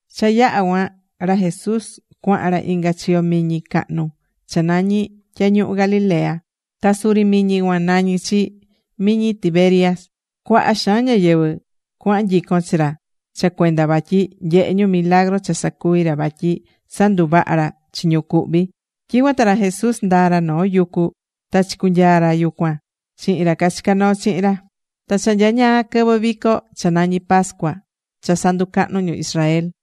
Cha yaha̱ cuan, ra Jesús cuahan ra inga chiyo miñi cahnu cha nañí Tyañuhu Galilea. Ta suri miñi cuan nañí chi Miñi Tiberias. Cuaha xaan ñáyɨvɨ cuahan nyicon chi ra cha cuenda vatyi nyehé ñu milagru cha sacuví ra vatyi sanduvahá ra chi ñu cuhví. Tyicuan ta ra Jesús ndaa̱ ra noo yucu ta chicunyaa̱ ra yucuan chihin ra cachicá noo chihin ra. Ta cha nyañaa quɨvɨ vico cha nañí pascua cha sanducahnú ñu Israel.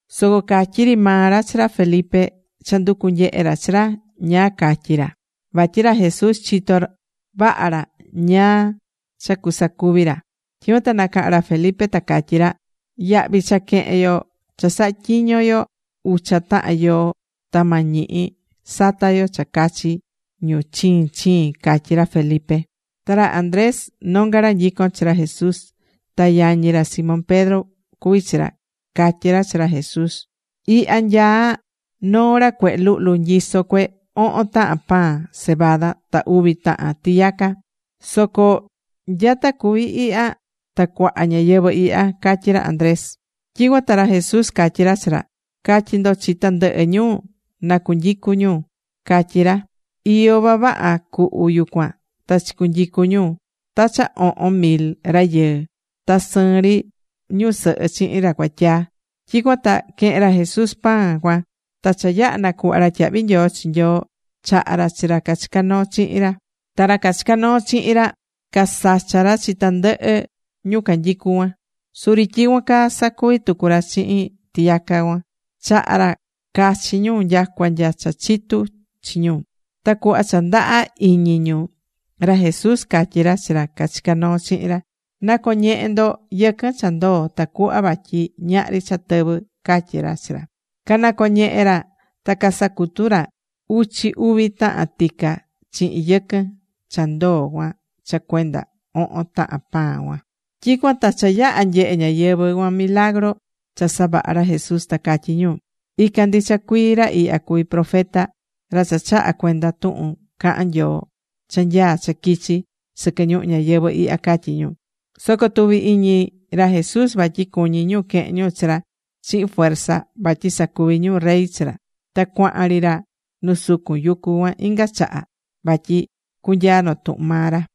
Soco catyi̱ ri maa ra chi ra Felipe cha nducú nyehe ra chi ra ñáá catyi ra, vatyi ra Jesús chitó vaha ra ñáá cha cuasacuvi ra. Tyicuan ta nacaha̱n ra Felipe ta catyi̱ ra: ―Yahvi cha quehen yo cha saha̱ tyiño yo ucha tahan yoo ta ma ñihi sata yo cha cachi ñu chiin chiin ―catyí ra Felipe. Ta ra Andrés nonga ra nyicón chi ra Jesús, ta yañi ra Simón Pedro cuví chi ra, catyí ra chi ra Jesús: ―Ihya nyaá noo ra cuehe luhlu nyisó cue ohon tahan pan cebada ta uvi tahan tiyaca. Soco ¿nyata cuví ihya ta cuaha ñáyɨvɨ ihya? ―catyí ra Andrés. Tyicuan ta ra Jesús catyí ra chi ra: ―Ca̱tyi ndo chi tandɨhɨ ñu na cunyicu ñu ―catyí ra. Iyó vavaha cuhu yucuan ta chicunyicu̱ ñu ta cha ohon mil rayɨɨ, ta sɨɨn ri ñusɨhɨ chihin ra cuatyaa. Tyicuan ta quehe̱n ra Jesús pan cuan ta cha yaha̱ nacuhva ra tyahvi nyoo chi Nyoo, chaha̱ ra chi ra cachicá noo chihin ra. Ta ra cachicá noo chihin ra casacha̱ ra chi tandɨhɨ ñu canyicú cuan. Suri tyicuan caa sacuvi̱ tucu ra chihin tiyaca cuan, chaha̱ ra cachi ñu nyacua nya cha chitu chi ñu. Ta cuhva cha ndaha iñi ñu, ra Jesús catyí ra chi ra cachicá noo chihin ra: ―Na̱coñehe ndo yɨquɨn cha ndoo tacuhva vatyi ñahri cha tɨvɨ ―catyí ra chi ra. Canacoñehe̱ ra, ta casacutu̱ ra uchi uvi tahan tica chihin yɨquɨn cha ndoo cuan cha cuenda ohon tahan pan cuan. Tyicuan ta cha yaha̱ nyehe ñáyɨvɨ cuan milagru cha savaha̱ ra Jesús, ta catyí ñu: ―Ican ndicha cuii ra ihya cuví profeta, ra chahá cuenda tuhun cahan Nyoo cha nyaá cha quichi sɨquɨ ñuhu ñayɨvɨ̱ ihya ―catyí ñu. Soco tuvi̱ iñi ra Jesús vatyi cuñí ñu quehen ñu chi ra chihin fuerza vatyi sacuvi ñu rey chi ra. Ta cuahan ri ra nu sucun yucu cuan inga chaha vatyi cunyaa notuhun maa ra.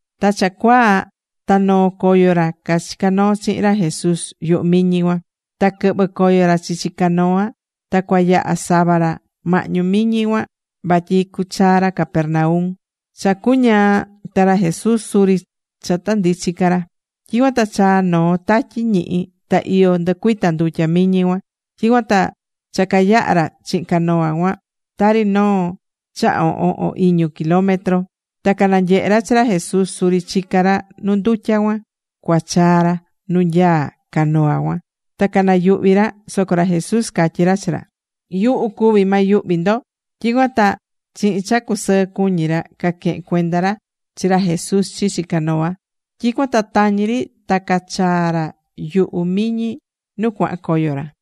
Ta cha cuaa, ta noo̱ coyo ra cachicá noo chihin ra Jesús yuhu miñi cuan. Ta quɨhvɨ̱ coyo ra chichi canoa ta cuayaha sava ra mahñu miñi cuan vatyi cuchaa ra Capernaum. Cha cuñaa ta ra Jesús suri cha ta ndichi ca ra. Tyicuan ta chaa̱ noo tatyi ñihi. Ta iyo ndɨcuita̱ ndutya miñi cuan. Tyicuan ta cha cayaha̱ ra chihin canoa cuan tari noo cha ohon o iñu kilómetro, ta cananyehe̱ ra chi ra Jesús suri chicá ra nu ndutya cuan cuachaa ra nu nyaá canoa cuan, ta canayuhvi̱ ra. Soco ra Jesús catyí ra chi ra: ―¡Yuhu cuví, ma yuhvi ndo! Tyicuan ta chihin cha casɨɨ cuñi ra caquehen cuenda ra chi ra Jesús chichi canoa. Tyicuan ta tañi ri ta cachaa̱ ra yuhu miñi nu cuahan coyo ra.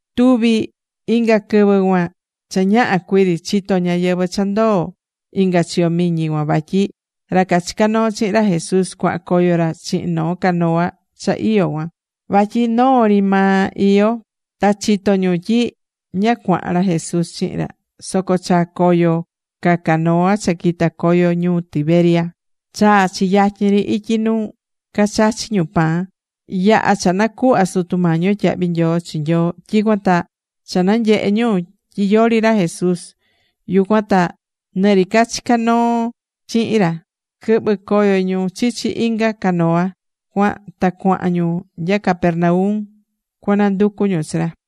Tuvi inga quɨvɨ cuan cha ñaha cuiri chitó ñáyɨvɨ cha ndoo̱ inga chiyo miñi cuan vatyi ra cachicá noo chihin ra Jesús cuahan coyo ra chihin noo canoa cha iyó cuan. Vatyi noo ri maa iyó. Ta chitó ñu tyi ña cuahan ra Jesús chihin ra. Soco chaa̱ coyo ca canoa cha quita̱ coyo ñuu Tiberias. Chaa̱ chi yatyin ri ityi nu cachachi̱ ñu pan, yaha̱ cha nacuhva̱ Sutu Mañi yo tyahvi nyoo chi Nyoo. Tyicuan ta cha nanyehe̱ ñu tyi yori ra Jesús yucuan ta nɨ ra cachicá noo chihin ra, quɨhvɨ̱ coyo ñu chichi inga canoa cuan ta cuahan ñu nya Capernaum cuananducu ñu chi ra.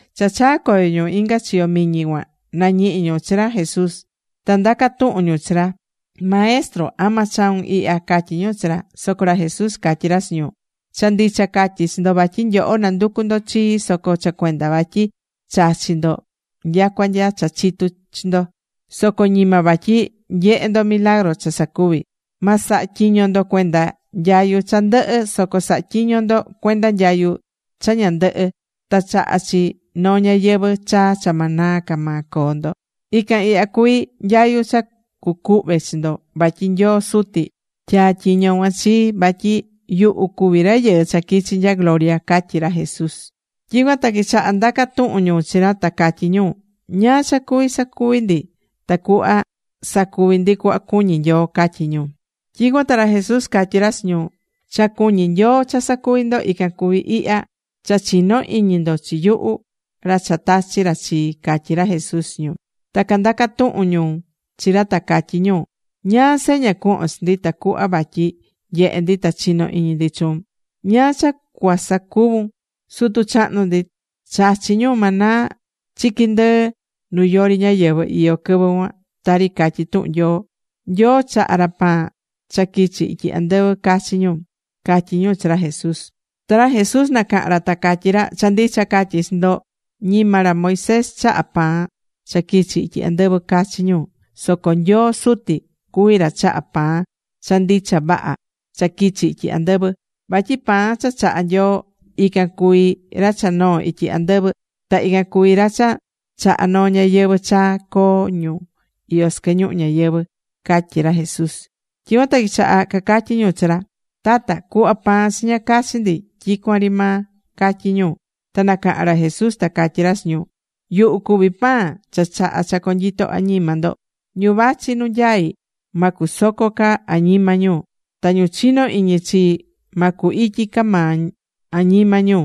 Cha chaa̱ coyo ñu inga chiyo miñi cuan, nañihi̱ ñu chi ra Jesús. Ta ndaca̱ tuhun ñu chi ra: ―Maestro, ¿ama chau̱n ihya? ―catyí ñu chi ra. Soco ra Jesús catyí ra chi ñu: ―Cha ndicha catyí chi ndo vatyi nyoho nanducú ndo chii soco cha cuenda vatyi chachi̱ ndo nyacua nya cha chitu̱ chi ndo. Soco ñima vatyi nyehe̱ ndo milagru cha sacuvi̱. Ma saha tyiño ndo cuenda nyayu cha ndɨhɨ, soco sa̱ha tyiño ndo cuenda nyayu cha ña ndɨhɨ́ ta chahá chi noo ñayɨvɨ̱ chaa cha ma naa ca maa coo ndo. Ican ihya cuví nyayu cha cucuhve chi ndo vatyi Nyoo Suti tyaa̱ tyiño cuan chii vatyi yuhu cuví Rayɨɨ cha quichi nya gloria ―catyí ra Jesús. Tyicuan ta quichaha̱ ndaca tuhun ñu chi ra ta catyí ñu: ―¿Ñáá cha cuví sacuvi ndi tacuhva sacuvi ndi cuhva cuñí Nyoo? ―catyí ñu. Tyicuan ta ra Jesús catyí ra chi ñu: ―Cha cuñí Nyoo cha sacuvi ndo ican cuví ihya: Cha chi̱no iñi ndo chi yuhu, ra cha tachi̱ ra chi ―catyí ra Jesús chi ñu. Ta candaca̱ tuhun tucu ñu chi ra, ta catyí ñu: ―¿Ñáá seña cuhvon chi ndi tacuhva vatyi nyehe ndi ta chino iñi ndi chuun? ¿Ñáá cha cuasacuvun? Sutu chahnu ndi chachi̱ ñu maná chiqui ndɨɨ nu yori ñáyɨvɨ iyó quɨvɨ cuan, tari catyí tuhun Nyoo: “Nyoo chaha̱ ra pan cha quichi̱ ityi andɨvɨ cachi ñu” ―catyí ñu chi ra Jesús. Ta ra Jesús nacaha̱n ra ta catyí ra: ―Cha ndicha catyí chi ndo. Ñima ra Moisés chaha̱ pan cha quichi̱ ityi andɨvɨ cachi ñu, soco Nyoo Suti cuví ra chahá pan cha ndicha vaha cha quichi̱ ityi andɨvɨ. Vatyi pan cha chahá Nyoo, ican cuví ra cha noo̱ ityi andɨvɨ. Ta ican cuví ra cha chahá noo ñayɨvɨ̱ chaa coo ñu iyó sɨquɨ ñuhu ñayɨvɨ̱ ―catyí ra Jesús. Tyicuan ta quichaha̱ cacatyí ñu chi ra: ―Tata, cu̱hva pan chiña cachi ndi tyicuan ri maa ―catyí ñu. Ta nacaha̱n ra Jesús ta catyí ra chi ñu: ―Yuhu cuví pan cha chahá cha conyito añima ndo. Ñu vachi nu nyaí ma cusoco ca añima ñu, ta ñu chino iñi chii ma cu ityi ca maa añima ñu.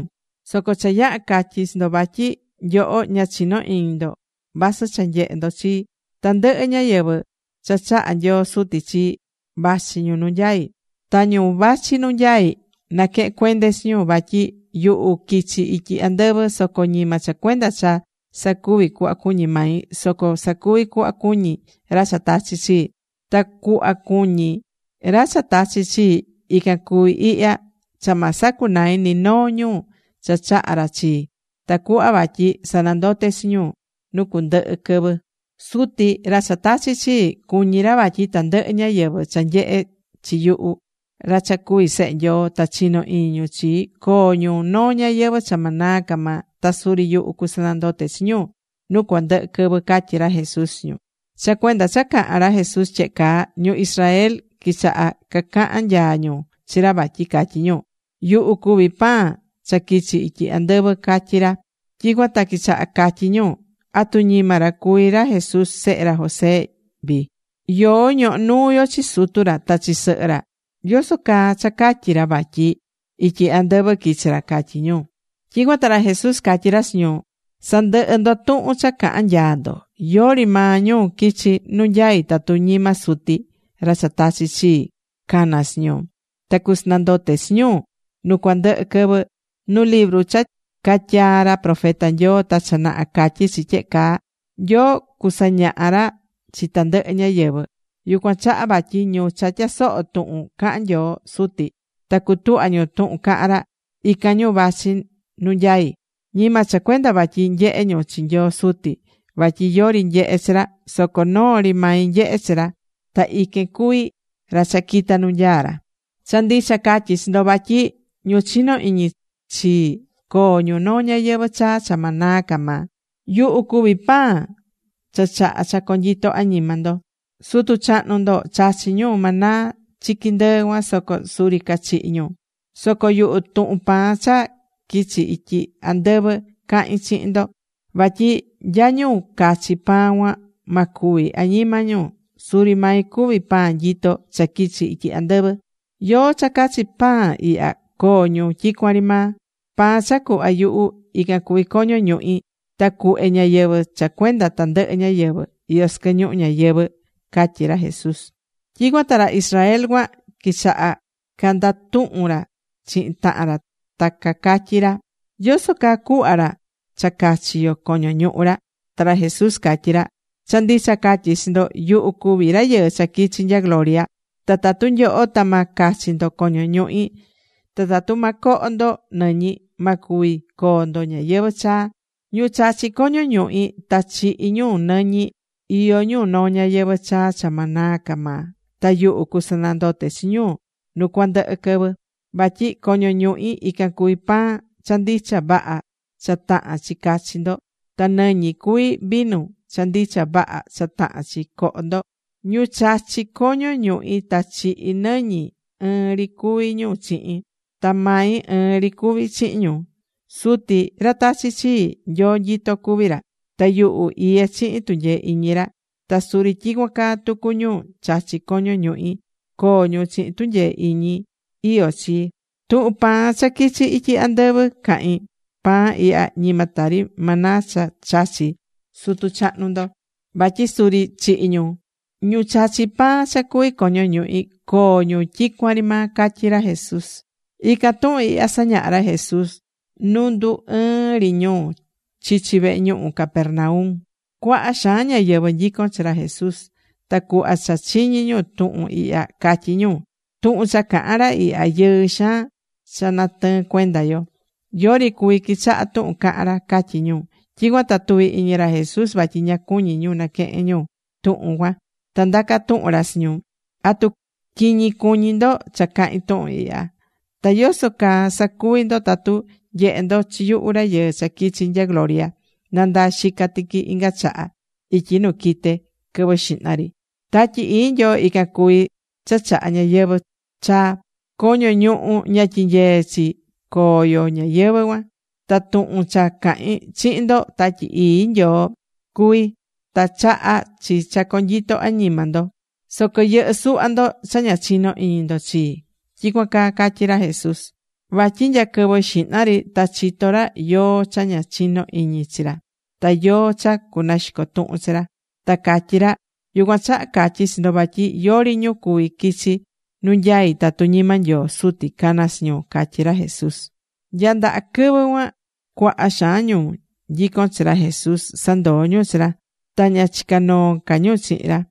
Soco cha yaha̱ catyi chi ndo vatyi nyoho ña chinó iñi ndo vasɨ cha nyehé ndo chii. Tandɨhɨ ñáyɨvɨ cha chaha̱ Nyoo Suti chii, vachi ñu nu nyaí, ta ñu vachi nu nyaí, naquehén cuende chi ñu. Vatyi yuhu quichi̱ ityi andɨvɨ soco ñima cha cuenda cha sacuvi cuhva cuñí mai, soco sacuvi cuhva cuñí ra cha tachi̱ chii. Ta cuhva cuñí ra cha tachi̱ chii, ican cuví ihya: cha ma sacunai ni noo ñu cha chahá ra chii, tacuhva vatyi sanandote chi ñu nu cuandɨhɨ quɨvɨ. Suti, ra cha tachi̱ chii, cuñí ra vatyi tandɨhɨ ñáyɨvɨ cha nyehe chi yuhu ra cha cuví Sehe Nyoo, ta chino iñi ñu chii, coo ñu noo ñayɨvɨ̱ cha ma naa ca maa. Ta suri yuhu cusanandote chi ñu nu cuandɨhɨ quɨvɨ ―catyí ra Jesús chi ñu. Cha cuenda cha caha̱n ra Jesús tyehe caa, ñu Israel quichaha cacahan nyaa ñu chi ra vatyi catyí ra: “Yuhu cuví pan cha quichi̱ ityi andɨvɨ”, catyí ra. Tyicuan ta quichaha catyí ñu: ―¿Atu ñima ra cuví ra Jesús, sehe ra José vii? Yoó ñohó nuu yo chi sutu ra ta chi sɨhɨ ra. ¿Yoso caa cha catyí ra vatyi ityi andɨvɨ quichi̱ ra? ―catyí ñu. Tyicuan ta ra Jesús catyí ra chi ñu: ―Sa̱ndɨhɨ ndo tuhun cha cahan nyaa ndo. Yori maa ñu quichi nu nyaí tatu ñima Suti, ra cha tachi̱ chii, cana chi ñu. Ta cusanandote chi ñu nu cuandɨhɨ quɨvɨ. Nu libru cha catyaa̱ ra profeta Nyoo ta cha naha catyí chi tyehe caa: “Nyoo cusañaha ra chi tandɨhɨ ñáyɨvɨ.” Yucuan chaha vatyi ñu cha tyasohó tuhun cahan Nyoo Suti ta cutuhvá ñu tuhun cahan ra, ican ñu vachi nu nyaí. ’Ñima cha cuenda vatyi nyehé ñu chi Nyoo Suti, vatyi yori nyehé chi ra. Soco noo ri mai nyehé chi ra. Ta iquen cuví ra cha quita̱ nu nyaá ra. Cha ndicha catyí chi ndo vatyi ñu chinó iñi chii coo ñu noo ñayɨvɨ̱ chaa cha ma naa ca maa. Yuhu cuví pan cha chahá cha conyito añima ndo. Sutu chahnu ndo chachi̱ ñu maná chiqui ndɨɨ cuan, soco suri cachihi̱ ñu. Soco yuhu, tuhun pan cha quichi̱ ityi andɨvɨ cahín chihin ndo, vatyi nya ñu cachi pan cuan, ma cúvi añima ñu. Suri mai cuví pan nyitó cha quichi̱ ityi andɨvɨ. Yóó cha cachi pan ihya coo ñu tyicuan ri maa. Pan cha cuhva yuhu, ican cuví coño ñuhi. Ta cuhve ñayɨvi̱ cha cuenda tandɨhɨ ñáyɨvɨ iyó sɨquɨ ñuhu ñayɨvɨ̱ ―catyí ra Jesús chi ñu. Tyicuan ta ra Israel cuan quichaha̱ candatuhun ra chihin tahan ra ta cacatyí ra: ―¿Yoso caa cuhva ra cha cachi yo coño ñuhu ra? Ta ra Jesús catyí ra: ―Cha ndicha catyí chi ndo, yuhu cuví Rayɨɨ cha quichi̱ nya gloria, ta tatu nyoho ta ma cachi ndo coño ñuhi, ta tatu ma coho ndo nɨñi, ma cuvi coo ndo ñayɨvɨ̱ chaa. Ñu chachí coño ñuhi ta chihí ñu nɨñi, iyó ñu noo ñayɨvɨ̱ chaa cha ma naa ca maa. Ta yuhu cusanandote chi ñu nu cuandɨhɨ quɨvɨ. Vatyi coño ñuhi ican cuví pan cha ndicha vaha cha tahán chi cachi ndo, ta nɨñi cuví vinu cha ndicha vaha cha tahán chi coho ndo. Ñu chachí coño ñuhi ta chihí nɨñi, ɨɨn ri cuví ñu chihin. Ta mai ɨɨn ri cuví chihin ñu. Suti ra tachi̱ chii, Nyoo nyitó cuví ra. Ta yuhu iyé chihin tunyee iñi ra. Ta suri tyicuan caa tucu ñu chachí coño ñuhi, coo ñu chihin tunyee iñi iyó chii. Tuhun pan cha quichi̱ ityi andɨvɨ cahín. Pan ihya ñima tari maná cha chachi̱ sutu chahnu ndo, vatyi suri chihi̱ ñu. Ñu chachí pan cha cuví coño ñuhi, coo ñu tyicuan ri maa ―catyí ra Jesús. Ican tuhun ihya sañaha̱ ra Jesús nu ndu ɨɨn ri ñu chichi vehe ñuhu Capernaum. Cuaha xaan ñáyɨvɨ nyicón chi ra Jesús. Ta cuhva cha chiñi̱ ñu tuhun ihya catyí ñu: ―Tuhun cha caha̱n ra ihya, yɨɨ xaan cha natɨɨn cuenda yo. Yori cuví quichaha tuhun cahán ra ―catyí ñu. Tyicuan ta tuvi̱ iñi ra Jesús vatyi ña cuñí ñu naquehen ñu tuhun cuan. Ta ndaca̱ tuhun ra chi ñu: ―¿Atu quiñi cuñí ndo cha cahín tuhun ihya? Ta ¿yoso caa sacuvi ndo tatu nyehe ndo chi yuhu Rayɨɨ cha quichi nya gloria nandaa xica tiqui inga chaha ityi nu quite quɨvɨ xihna ri? Tatyi Ii Nyoo ican cuví cha chahá ñayɨvɨ̱ chaa. Coño ñuhu, ña tyinyeé chi coo yo ñayɨvɨ̱ cuan. Ta tuhun cha cahín chihin ndo, Tatyi Ii Nyoo cuví ta chahá chi cha conyito añima ndo. Soco yɨhɨ́ suhva ndo cha ña chinó iñi ndo chii ―tyicuan caa catyí ra Jesús. Vatyi nya quɨvɨ xihna ri ta chitó ra yóó cha ña chinó iñi chi ra ta yóó cha cunaxico tuhun chi ra. Ta catyí ra: ―Yucuan chaha catyí chi ndo vatyi yori ñu cuví quichi nu nyaí tatu ñima Nyoo Suti cana chi ñu ―catyí ra Jesús. Nya ndaha quɨvɨ cuan cuaha xaan ñu nyico̱n chi ra Jesús sandoo̱ ñu chi ra. Ta ña chicá noo ca ñu chihin ra.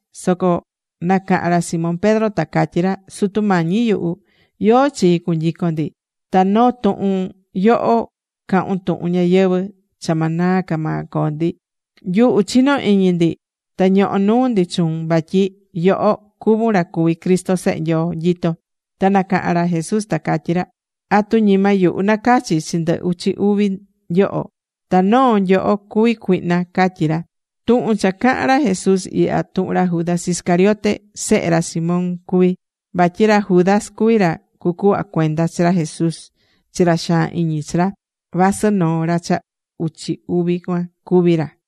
Soco nacahan ra Simón Pedro ta catyí ra: ―Sutu Mañi yuhu, ¿yóó chi cunyicon ndi? Ta noo tuhun yoho cahún tuhun ñayɨvɨ̱ cha ma naa ca maa coo ndi. Nyuhu chinó iñi ndi, ta ñoho nuu ndi chuun vatyi yoho cuvún ra cuví Cristo Sehe Nyoo nyitó. Ta nacaha̱n ra Jesús ta catyí ra: ―¿Atu ñima yuhu nacachi̱ chi ndɨ uchi uvi nyoho? Ta noo nyoho cuví cuihna ―catyí ra. Tuhun cha cahán ra Jesús ihya, tuhun ra Judas Iscariote sehe ra Simón cuví. Vatyi ra Judas cuví ra cucuhva cuenda chi ra Jesús chi ra xaan iñi chi ra, vasɨ noo ra cha uchi uvi cuan cuví ra.